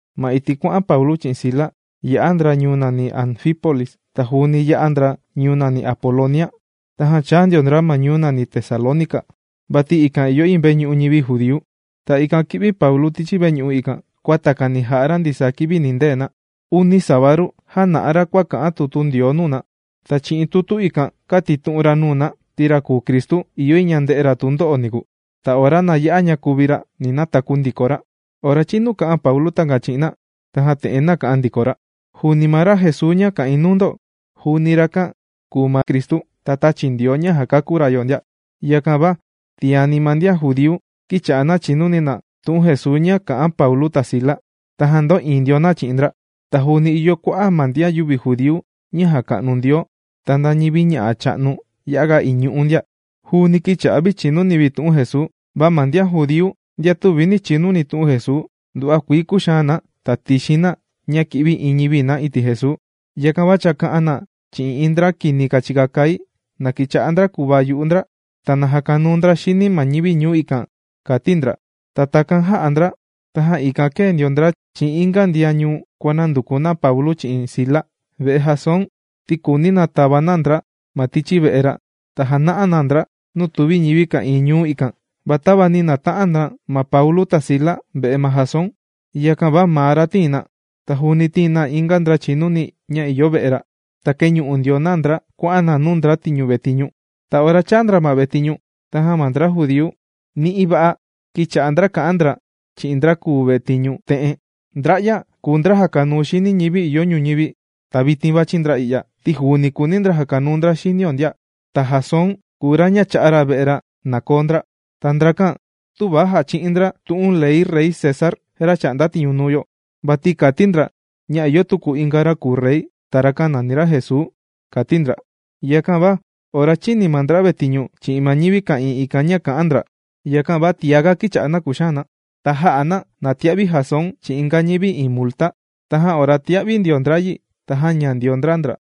Ma iti' kuà'an Paulu chi'in Sila yā'a ndra ñuu nàni Anfípolis, ta juuni yā'a ndra ñuu nàni Apolonia. Tajan chāa ndio ndra ñuu nàni Tesalónica, vati ikan ìyo iin veñu'u ñivi judíu. Ta ikan kī'vi Paulu ma tichi veñu'u ikan, kua takani jà'a ra ndisaa kivi nindee na. Uni sabadu jāna'a ra kua kà'an tutu Ndioo nuu na. Ta chi'in tutu ikan kātitu'un ra nuu na ti ra kùu Cristu ìyo yi ña nde'e ra tundo'o niku. Ta ora na ya'a ña kuvi ra ni nataku ndiko ra. Ora chīnu kā'an Paulu takan chi'in na, tajan te'en nāka'an ndiko ra: ―Juuni ma ra Jesuu ña kà'in nuu ndo, juuni rakan kùu ma Cristu, ra tāchi Ndioo ña jàkakú ra yo ndia. Yakan va tiani ma ndian judíu kīcha'a na chìnuni na tu'un Jesuu ña kà'an Paulu ta Sila, tajan ndō'iin ndio na chi'in ndra. Ta juuni ìyo kua'a' ma ndian yüvi judíu ña jàka'nu Ndioo, ta nda ñivi ña'a' cha'nu ya'a ga iñu'u ndia, juuni kīcha'a vi chìnuni vi tu'un Jesuu. Va ma ndian judíu ndian tüvi nī chinuni tu'un Jesuu nduva'a kuii kūxaan na ta tīxin na ña kì'vi iin ñivi na iti' Jesuu. Yakan va chāka'an na chi'in iin ndra kini kàchika kai na kīcha'a ndra kùvaa yu'u ndra ta na jakanuu ndra xini ma ñivi ñuu ikan, kàti ndra. Ta takan jā'a ndra, tajan ikan kēe ndio ndra chi'in inga ndian ñuu kuànanduku na Paulu chi'in Sila ve'e Jasón, ti kùuni na tava na ndra ma tichi ve'e ra ta jana'a ndio na ndra nuu tùvi ñivi ka'ìin ñuu ikan. Va tava nī nata'an na ma Paulu ta Sila ve'e ma Jasón, yakan va maa ra tīin na. Ta juuni tīin na inga ndra chìnuni ña ìyo ve'e ra. Ta kēñu'u ndio na ndra kuà'an na nuu ndra kùvetiñu. Ta ora chāa na ma vetiñu, tajan ma ndra judíu ni'i va'a kīcha'a kà'an ndra chi'in ndra kùvetiñu te'en: ―Ndra'ya kùu ndra jàkanuu xini ñivi ìyo ñuñivi, ta vitin vàchi ndra i'ya, ti juuni kùuni ndra jakanuu ndra xinio ndia. Ta Jasón kùu ra ña chā'a ra ve'e ra na koo ndra. Ta ndrakan tüva jachi'in ndra tu'un ley Rey César, ra chà'nda tiñu nuu yo, vati kàti ndra ña ìyo tuku inga ra kùu rey, ta rakan nàni ra Jesuu ―kàti ndra. Yakan va ora chīni ma ndra vetiñu chi'in ma ñivi ka'ìin ikan ña kà'an ndra, yakan va tiaga kīcha'a na kùxaan na. Ta jā'a na na tia'vi Jasón chi'in inga ñivi iin multa. Tajan ora tīa'vi ndio ndra yi ta jāña ndio ndra ndra.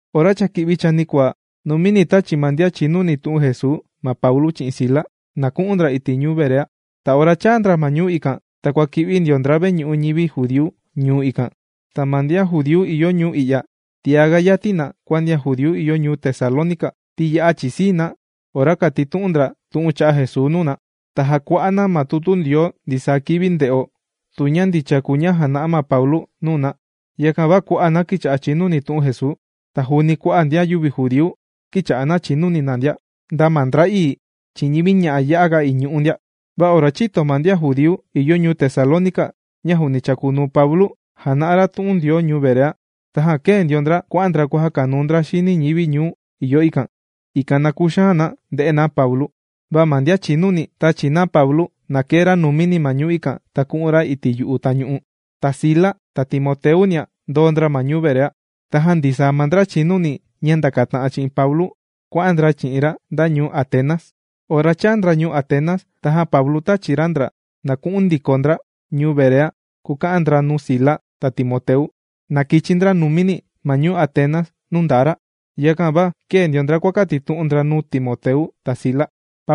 Ora cha kī'vi ma chanikuaa, numini tāchi ma ndian chìnuni tu'un Jesuu ma Paulu chi'in Sila, na ku'un ndra iti' ñuu Berea. Ta ora chāa ndra ma ñuu ikan, ta kuàki'vi ndio ndra veñu'u ñivi judíu ñuu ikan. Ta ma ndian judíu ìyo ñuu i'ya tiá yati na kua ndian judíu ìyo ñuu Tesalónica, ti ya'a chìsii na ora kàtitu'un ndra tu'un cha'a' Jesuu nuu na. Ta jàkua'a na ma tutu Ndioo ndisaa kivi, nde'o tu ña ndicha kùu ma ña jàna'a ma Paulu nuu na. Yakan va kua'a' na kīcha'a chìnuni tu'un Jesuu, ta juuni kua'a' ndian yüvi judíu kīcha'a chìnuni na ndia, nda ma ndra'ii chi'in ñivi ña'a ya'a ga iñu'u ndia. Va ora chīto ma ndian judíu ìyo ñuu Tesalónica ña juuni chàkunuu Paulu jàna'a ra tu'un Ndioo ñuu Berea, tajan kēe ndio ndra kuà'an ndra kuàjakanuu ndra xini ñivi ìyo ñuu ikan, ikan na kuxaan na nde'e na Paulu. Va ma ndian chìnuni tāchi na Paulu na kee ra numini ma ñuu ikan ta ku'un ra iti' yu'u tañu'u. Ta Sila ta Timoteunia ndōo ndra ma ñuu Berea. Tajan ndisaa ma ndra chìnuni ña ndakata'an chi'in Paulu kuà'an ndra chi'in ra nda ñuu Atenas. Ora chāa ndra ñuu Atenas, tajan Paulu tāchi ra ndra na ku'un ndiko ndra ñuu Berea kuka'an ndra nuu Sila ta Timoteu, na kichi numini ndra ma ñuu Atenas nuu ndaa ra. Yakan va kēe ndio ndra kuàkatitu'un ndra nuu Timoteu ta Sila.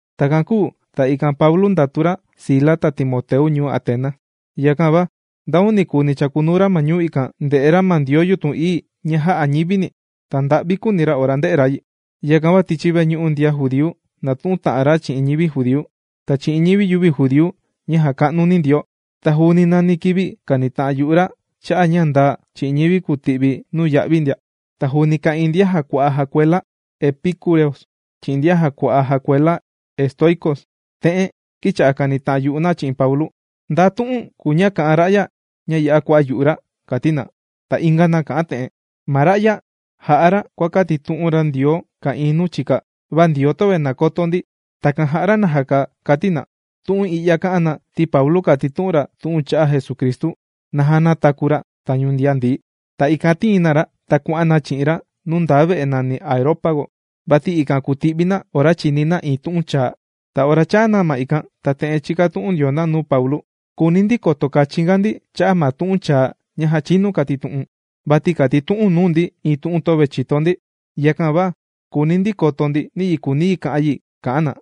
Takan kūu ta ikan Paulu ndàtu ra Sila ta Timoteu ñuu Atenas. Yakan va ndanikuni ma nuu chàkunuu ra ñuu ikan, ndè'e ra ma ndioo yutun ií ña jà'a ñivini. Ta nda'vi kūuni ra ora ndē'e ra yi. Yakan va tichi veñu'u ndian judíu nàtu'un ta'an ra chi'in ñivi judíu, ta chi'in ñivi yüvi judíu ña jàka'nu Ndioo. Ta juuni nani kivi kànita'an yu'u ra cha'a' ña ndaa chi'in ñivi kùti'vi nuya'vi ndia. Ta juuni ka'ìin ndian jàkua'a jakuela epicúreos, chi'in ndian jàkua'a jakuela estoicos, te'en kīcha'a na kànita'an yu'u na chi'in Paulu: ―¿Nda tu'un kùu ña kà'an ra'ya ña ya'a kua'a' yu'u ra? ―kàti na. Ta inga na kà'an te'en: ―Ma ra'ya jà'a ra, ña kuàkatitu'un ra tu'un cha'a' ndioo ka'ìin nuu chika, va kùu ndra ndioo töve nàkoto ndi. Takan jà'a ra najaka ―kàti na. Tu'un i'ya kā'an na, ti Paulu kàtitu'un ra tu'un cha'a' Jesucristu, naja nātaku ra tañu ndian ndií. Ta ikan tīin na ra, ta kuà'an na chi'in ra nuu ndaa ve'e nàni Areópago. Vati ikan kùti'vi na ora chìni na iin tu'un chaa. Ta ora chāa na ma ikan, ta te'en chīkatu'un ndio na nuu Paulu: ―Kùuni ndi koto kachin ga ndi cha'a' ma tu'un chaa ña já chinu kātitu'u̱n. Vati kàtitu'u̱n nuu ndi iin tu'un ña töve chìto ndi. Yakan va kùuni ndi koto ndi niyi kùuni yi kà'an yi ―kà'an na.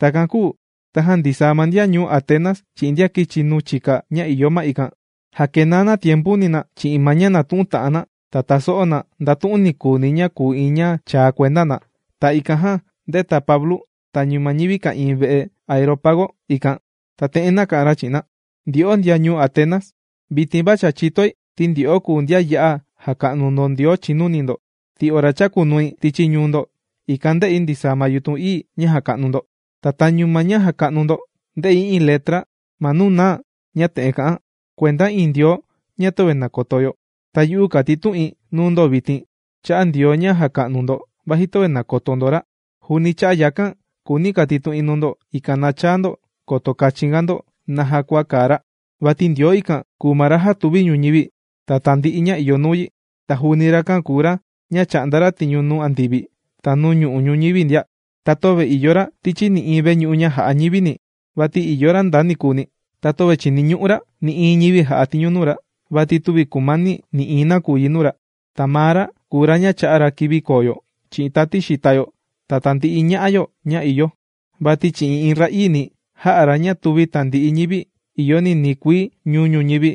Takan kūu tajan ndisaa ma ndian ñuu Atenas chi'in ndian kìchi nuu chika ña ìyo ma ikan, jàkenaa na tiempuni chi'in ma ña nàtu'un na ta tàso'o na nda tu'un nikuuni ña kùu iin ña chaa kuenda na. Ta ikan jan ndēta Paulu tañu ma ñivi ka'ìin ve'e Areópago ikan, ta te'en nāka'an ra chi'in na: ―Ndyo'o ndian ñuu Atenas, vitin va cha chìtoi ti ndyo'o kùu ndian ya'a jàka'nu ndo ndioo ña ya'a chìnuni ndo, ti ora chākunui tichi ñuu ndo, ikan ndē'i ndisaa ma yutun ií ña jàka'nu ndo. Ta tañu ma ña jàka'nu ndo, ndē'i iin letra ma nuu naa ña te'en kà'an: “Kuenda iin Ndioo ña töve nàkoto yo.” Ta yu'u kàtitu'in nuu ndo vitin cha'a' Ndioo ña jàka'nu ndo vaji töve nàkoto ndo ra. Juuni cha'a' yakan kùuni kàtitu'in nuu ndo, ikan na chaa ndo koto kachin ga ndo naja kua kàa ra. ’Vati Ndioo ikan kùu ma ra jātuvi ñuñivi, ta tandi'i ña ìyo nuu yi. Ta juuni rakan kùu ra ña chà'nda tiñu nuu andivi ta nuu ñu'u' ñuñivi ndia. Ta töve ìyo ra tichi nï'iin veñu'u ña jà'a ñivini vati ìyo ra ndanikuni. Ta töve chìniñu'u ra nï'iin ñivi jà'a tiñu nuu ra. Vati tüvi kùmani nï'iin nakuyi nuu ra. Ta maa ra kùu ra ña chà'a ra kivi koo yo, chi'in tati xìta yo, ta tandi'i ña'a yo ña ìyo. ’Vati chi'in iin ra'ii ni, jā'a ra ña tùvi tandi'i ñivi ìyo ninii kuii ñu'u' ñuñivi,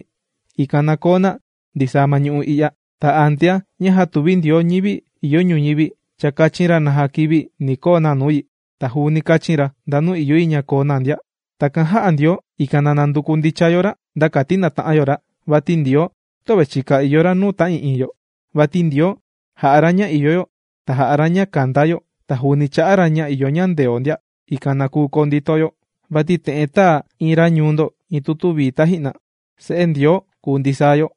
ikan na koo na ndisaa ma ñu'u' i'ya. Ta antea ña jātuvi Ndioo ñivi ìyo ñuñivi cha kāchin ra naja kivi ni koo na nuu yi, ta juuni kāchin ra ndanu ìyo yi ña koo na ndia. Takan jā'a Ndioo, ikan na nanduku ndicha yo ra nda kati nata'an yo ra, vati Ndioo tüvi chika ìyo ra nuu ta'ii'iin yo. Vati Ndioo jà'a ña ìyo yo, ta jà'a ra ña kanda yo, ta juuni chà'a ra ña ìyo ñandeo ndia, ikan na kuu koo ndito yo. Vati te'en tāa iin ra ñuu ndo iin tutu vii taji'na: “Se'e Ndioo kùu ndisaa yo.”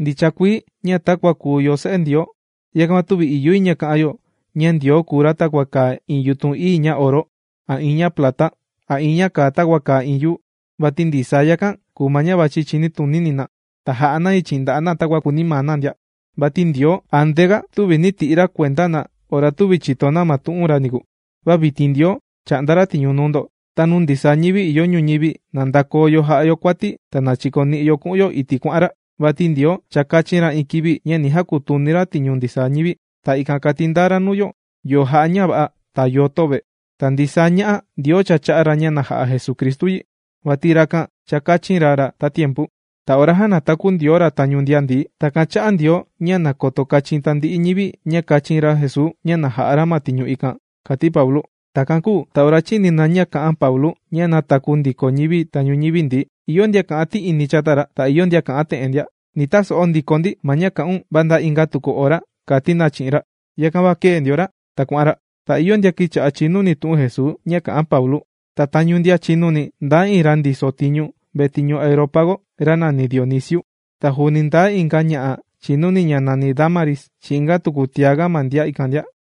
Ndicha kuii ña takua kùu yo se'e Ndioo, yakan va tüvi ìyo yi ña ka'an yo ña Ndioo kùu ra takua kàa iin yutun ií ña oro, a iin ña plata, a iin ña kàa takua kàa iin yuu. Vati ndisaa yakan kùu ma ña vàchi ma chinitunini na, ta jà'a na yi chi'in nda'a' na takua kùuni maa na ndia. Vati Ndioo antea tüvi nī ti'i ra kuenda na ora tüvi chìto na ma tu'un ra niku. Va vitin Ndioo chà'nda ra tiñu nuu ndo, ta nuu ndisaa ñivi ìyo ñuñivi na ndakoo yo jà'a yo kuati ta na chikoni'o ku'un yo iti' kuà'an ra. Vati Ndioo cha kāchin ra iin kivi ña ni jakutuni ra tiñu ndisaa ñivi. Ta ikan kàti ndaa ra nuu yo, yo jà'a ña va'a, ta yo töve. Ta ndisaa ña'a Ndioo cha chā'a ña na ja'a Jesucristu yi. Vati rakan cha kāchin ra ra tatiempu. Ta ora jānataku Ndioo ra tañu ndian ndií, takan chā'a Ndioo ña nakoto kachin tandi'i ñivi ña kāchin ra Jesuu ña na ja'a ra ma tiñu ikan ―kàti Paulu. Takan kūu ta ora chīni na ña kā'an Paulu ña nātaku ndiko ñivi tañu ñivi ndií, ìyo ndian kà'an ti'ini chata ra, ta ìyo ndian kà'an te'en ndia: ―Ni taso'o ndiko ndi ma ña kà'un va nda inga tuku ora ―kàti na chi'in ra. Yakan va kēe ndio ra ta kuà'an ra. Ta ìyo ndian kīcha'a chìnuni tu'un Jesuu ña kà'an Paulu. Ta tañu ndian chìnuni ndaa iin ra ndiso tiñu vetiñu Areópago, ra nàni Dionisio. Ta juuni ndaa iin ña'a chìnuni ña nàni Dámaris chi'in inga tuku tiaga na ma ikan ndia.